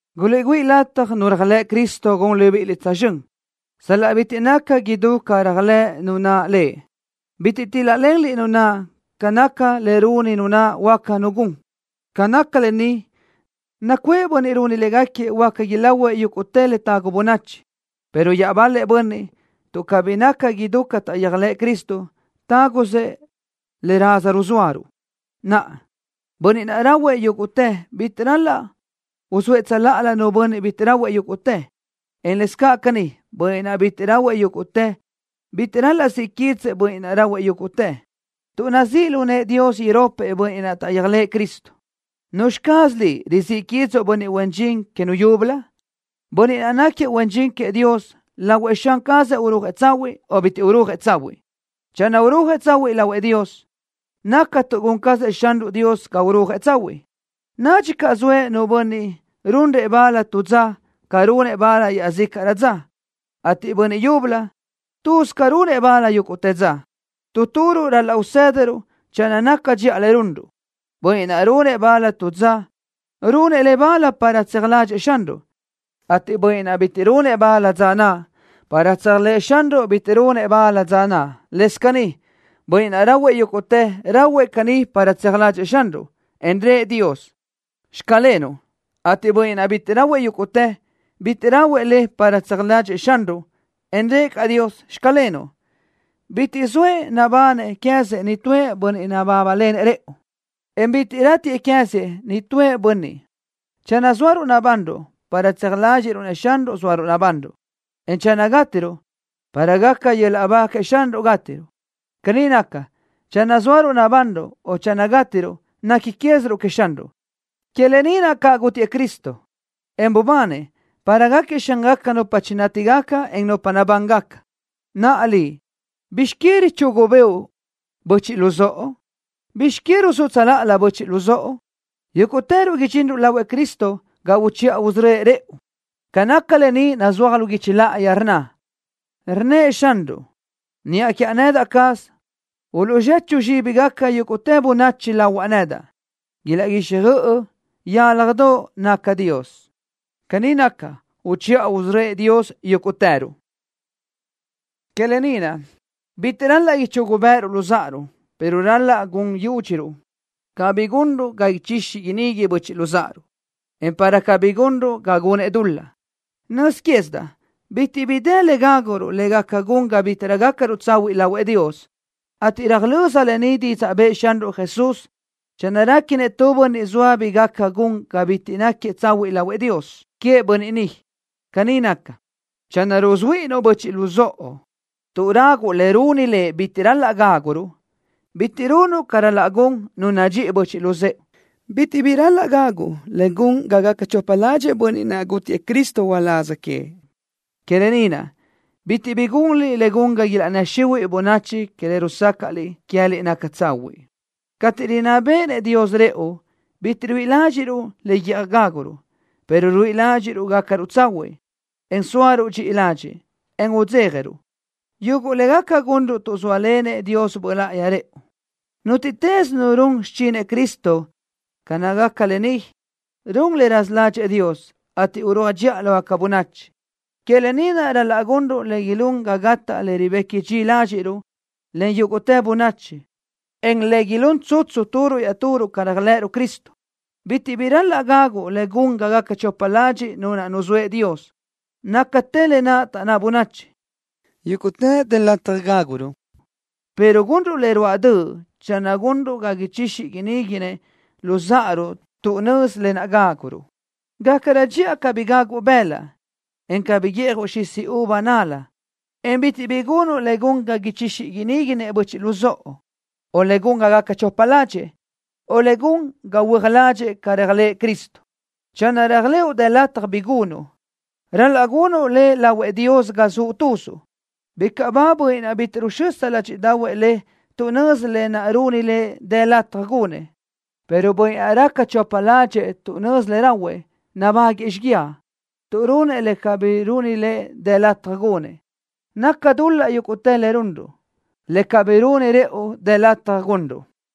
Guliʼgüíʼ lataj nu réajlëʼ Cristo gun libíʼiliʼ tsözxö́n sal-laʼ bitiʼ naca idú ca réajlëʼ nu naʼ Lëʼ. Bitiʼ tíl-lalenliʼ nu naʼ ca nácagaca le runi nu naʼ huáca nu gun. Ca naca lë ni, nacuʼë bönniʼ runi légaquiëʼ huáca ilahuëʼ yúguʼtë le tagu bönachi, pero iaʼbal-lëʼ bönniʼ, tuʼ cabí naca idú ca taʼyéajlëʼë Cristo, tágusëʼ le raza ruzóaruʼ. Naʼa, bönniʼ naʼ rahuëʼ yúguʼtë bitiʼ ral-laʼ uzóëʼ tsöláʼalö nu bönniʼ bitiʼ rahuëʼ yúguʼtë, en lëscaʼ caní, bönniʼ naʼ bitiʼ rahuëʼ yúguʼtë bitiʼ ral-laʼ siʼ quídzëʼë bönniʼ naʼ rahuëʼ yúguʼtë, tuʼ nazíʼ lu nëʼë Dios iropëʼ bönniʼ naʼ taʼyéajlëʼë Cristo. ¿Nuzxi caz liʼ, rizíʼ quídzuʼu bönniʼ huen dxin que nu yúbölö? Bönniʼ naʼ náquiëʼ huen dxin queëʼ Dios, lahuëʼ Xan cazëʼ urúajëʼ tsahuiʼ o bitiʼ urúajëʼ tsahuiʼ. Channö urúajëʼ tsahuiʼ lahuëʼ Dios, naca tuʼ gun cazëʼ Xanruʼ Dios ga urúajëʼ tsahuiʼ. Nadxi caʼ zoëʼ nu bönniʼ runrëʼ bal tu dza ca runëʼ bal iaʼzícaʼrö dza, ateʼ bönniʼ yúbölö, tuz ca runëʼ bal yúguʼtë dza. Tu turuʼ ral-laʼ usë́dadaʼaruʼ channö naca dxiʼa le runruʼ. Bönniʼ naʼ runëʼ bal tu dza, runëʼ le bal para tseaj ládxëʼë Xanruʼ, ateʼ bönniʼ naʼ bitiʼ runëʼ bal dza naʼ, para tseaj ládxëʼë Xanruʼ bitiʼ runëʼ bal dza naʼ. Lëscaʼ caní, bönniʼ naʼ rahuëʼ yúguʼtë, rahuëʼ caní para tseaj ládxëʼë Xanruʼ, en rëʼë Dios: “Xclenuʼ”, ateʼ bönniʼ naʼ bitiʼ rahuëʼ yúguʼtë, bitiʼ rahuëʼ le para tseaj ládxëʼë Xanruʼ, en rëʼë caʼ Dios: “Xclenuʼ.” Bitiʼ zoëʼ nabanëʼ queë́zëʼ nitúëʼ bönniʼ nabábalenëʼ rëʼu, en bitiʼ ratiëʼ queë́zëʼ nitúëʼ bönniʼ. Channö zóaruʼ nabanruʼ, para tseaj ládxiʼruʼ-nëʼ Xanruʼ zóaruʼ nabanruʼ, en channö gátiruʼ, para gaca yöl-laʼ ba queëʼ Xanruʼ gátiruʼ. Caní naca, channö zóaruʼ nabanruʼ o channö gátiruʼ, nequi quéziruʼ queëʼ Xanruʼ. Que lë ni naʼ caʼ gútiëʼ Cristo, en bubanëʼ, para gáquiëʼ Xángaca nupa chinátigaca, en nupa nabángaca. Naʼa liʼ, ¿bizx que richugu bëʼu böchiʼ luzóʼo? ¿Bizx que ruzúʼ tsöláʼalö böchiʼ luzóʼo? Yúguʼtëruʼ idxinruʼ lahuëʼ Cristo ga uchiʼa usörö́ëʼ rëʼu. Ca naca lë ni nazúaj lu guichi láʼayi, rnna: Rnnëʼ Xanruʼ: “Niʼa quiaʼ nedaʼ caz, uluʼzechu zxíbigaca yúguʼtë bönachi lahuaʼ nedaʼ. Ilaʼguixjöʼ yálajdoʼ nacaʼ Dios.” Caní naca, uchiʼa usörö́ëʼ Dios yúguʼtëruʼ. Que lë ni naʼ, bítiʼrö ral-laʼ ichugu béʼeruʼ luzáʼaruʼ, pero ral-laʼ gun yúdxiruʼ cabí gunruʼ ga ichixi iníguinëʼ böchiʼ luzáʼaruʼ, en para cabí gunruʼ ga gunëʼ dul-laʼ. Nöz quézidaʼ bitiʼ bi dë le ráguruʼ le gaca gun ga bítiʼrö nácaruʼ tsahuiʼ lahuëʼ Dios, ateʼ röjlö́z lë ni didzaʼ bëʼë Xanruʼ Jesús. Channö réquinëʼ tu bönniʼ zoa bi gaca gun ga bítiʼrö náquiëʼ tsahuiʼ lahuëʼ Dios, queëʼ bönniʼ ni, caní naca. Channö rusuhuíʼinnuʼ böchiʼ luzóʼo, tuʼ raguʼ le runi lëʼ bitiʼ ral-laʼ gáguruʼ, bitiʼ runuʼ ca ral-laʼ gun nu nadxíʼi böchiʼ luzë́ʼe. Bitiʼ bi ral-laʼ gaguʼ le gun ga gaca chopa ládxëʼë bönniʼ naʼ, gútiëʼ Cristo uláz queëʼ. Que lë ni naʼ, bitiʼ bi gunliʼ le gun ga ilaʼnnë́ xihuiʼ bönachi que le rusácaʼliʼ queë́liʼ naca tsahuiʼ. Cateʼ rinná béʼenëʼ Dios rëʼu, bitiʼ ruíʼi ládxiʼruʼ le guíʼaj gáguruʼ, pero ruíʼi ládxiʼruʼ gácaruʼ tsahuiʼ, en sóaruʼ dxi ladxiʼ, en udzéjaruʼ, yuguʼ le gaca gunruʼ tuʼ zóalenëʼ Dios Böʼ Láʼayi rëʼu. Nútiʼtës nu run xichinëʼ Cristo ca nácagaca lë ni, run le raza ládxëʼë Dios, ateʼ urúaj dxiʼa lógaca bönachi. Que lë ni naʼ ral-laʼ gunruʼ le ilún ga gataʼ le ribequi dxi ládxiʼruʼ len yúguʼtë bönachi, en le ilún tsutsu turuʼ iaʼturuʼ ca réajlëʼëruʼ Cristo. Bitiʼ bi ral-laʼ gaguʼ le gun ga gaca chopa ladxiʼ nu naʼ nuzóëʼ Dios. Nácatë lë naʼ taʼnná bönachi: “Yúguʼtë dë lataj gáguruʼ”, pero gunruʼ le ruáʼ döʼ channö gunruʼ ga ichixi iníguinëʼ luzáʼaruʼ tuʼ nözi lë naʼ ráguruʼ. Gácarö dxiʼa cabí gaguʼ bëlaʼ, en cabí guíʼjuʼ xisi uva nal-la, en bitiʼ bi gunuʼ le gun ga ichixi iníguinëʼ böchiʼ luzóʼo, o le gun ga gaca chopa ládxëʼë, o le gun ga huö́aj ládxëʼë ca réajlëʼë Cristo. Channö réajlëʼu dë lataj bi gunuʼ, ral-laʼ gunuʼ le lahuëʼ Dios ga zuʼ tuzuʼ. Bicaʼ ba bönniʼ naʼ bitiʼ ruxösa ládxiʼdaʼahuëʼ lëʼ tuʼ nözi lë naʼ runi lëʼ dë lataj gunëʼ, pero bönniʼ naʼ raca chopa ládxëʼë tuʼ nözi le rahuëʼ, nabáguëʼë xíguiaʼ, tuʼ runëʼ le cabí runi lëʼ dë lataj gunëʼ. Naca dul-laʼ yúguʼtë le runruʼ, le cabí runi rëʼu dë lataj gunruʼ.